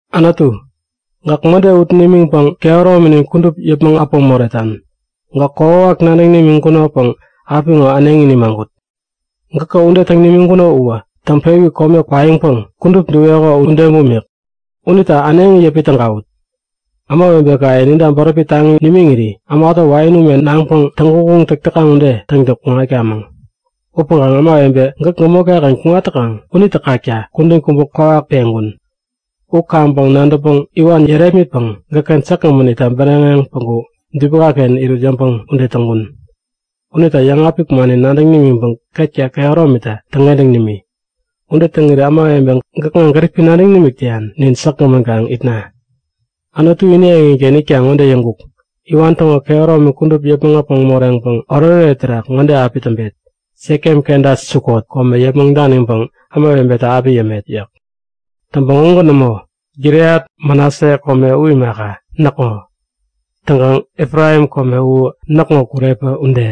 Anutu, gäk mäde ut nimiŋpäŋ kehärominin kudup yäpmäŋ äpäŋ moretan. Gäk kokwawak nadäŋ nimiŋkunopäŋ apiŋo äneŋi nimagut. Gäkä ude täŋ nimiŋkuno uwä täŋpewi kome kwaiŋpäŋ kudup duŋ-weko ude bumik. Unita äneŋi yäpi tägawut! Ämawebekaye ninta bäräpi taŋi nimiŋiri, ämatä wain ume naŋpäŋ täŋguŋguŋ täk täkaŋ ude täŋtäŋ kuŋatkamäŋ. Upäŋkaŋ ämawebe gäk gämotkaken kuŋat täkaŋ unitä kakta kudän kubä kwawak peŋkun. U kaŋpäŋ nadäŋpäŋ iwan yärepmitpäŋ gäkken säkgämän itta bäräŋeŋ päŋku dubinaken irut yäŋpäŋ ude täŋkun. Unita yäŋapik mannin nadäŋ nimiŋpäŋ ketka kehäromitä täŋkentäŋ nimi. Ude täŋiri ämawebe gäkŋa gäripi nadäŋ nimik täyan nin säkgämän kaŋ itna. Anutu ini eŋiken itkaŋ ŋode yäŋkuk; Iwan täŋo kehäromi kudup yäpmäŋ äpäŋ moreŋpäŋ oretoret terak ŋode api täŋpet; Sekem kenta Sukot kome yäpmäŋ daniŋpäŋ ämawebenayeta api yämet yäk. Täŋpäŋ ugän nämo. Gileat Manase kome u imaka, näkŋo. Täŋkaŋ Efraim kome u näkŋo kurepä ude,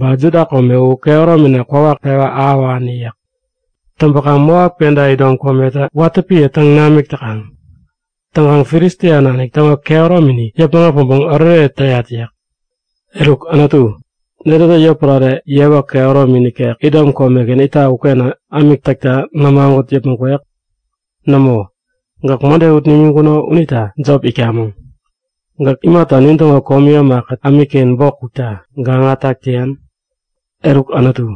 ba Juda kome u kehäromina kwawak pewä ahäwani yäk. Täŋpäkaŋ Moap kenta Idom kometä watä piä täŋ namik täkaŋ. Täŋkaŋ Filistia nanik täŋo kehäromini yäpmäŋ äpäŋpäŋ oretoret täyat yäk. Eruk Anutu, netätä yotpärare yewa kehäromi nikek, Idom komeken itak uken ämik täkta nämagut yäpmäŋ kwek? Nämo! Gäk mäde ut nimiŋkuno unita jop itkamäŋ. Gäk imata nintäŋo komi ämakät ämikken bok kukta gaŋa täk täyan? Eruk Anutu,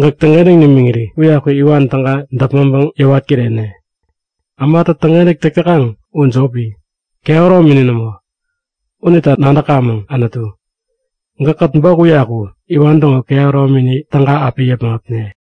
gäk täŋkentäŋ nimiŋiri uyaku iwan täga däpmäŋpäŋ yäwat kirene. Ämatä täŋkentäk täk täkaŋ u jopi, kehäromini nämo. Unita nadäkamäŋ! Anutu, gäkkät bok uyaku iwan täŋo kehäromini täga api yäpmäŋ äpne!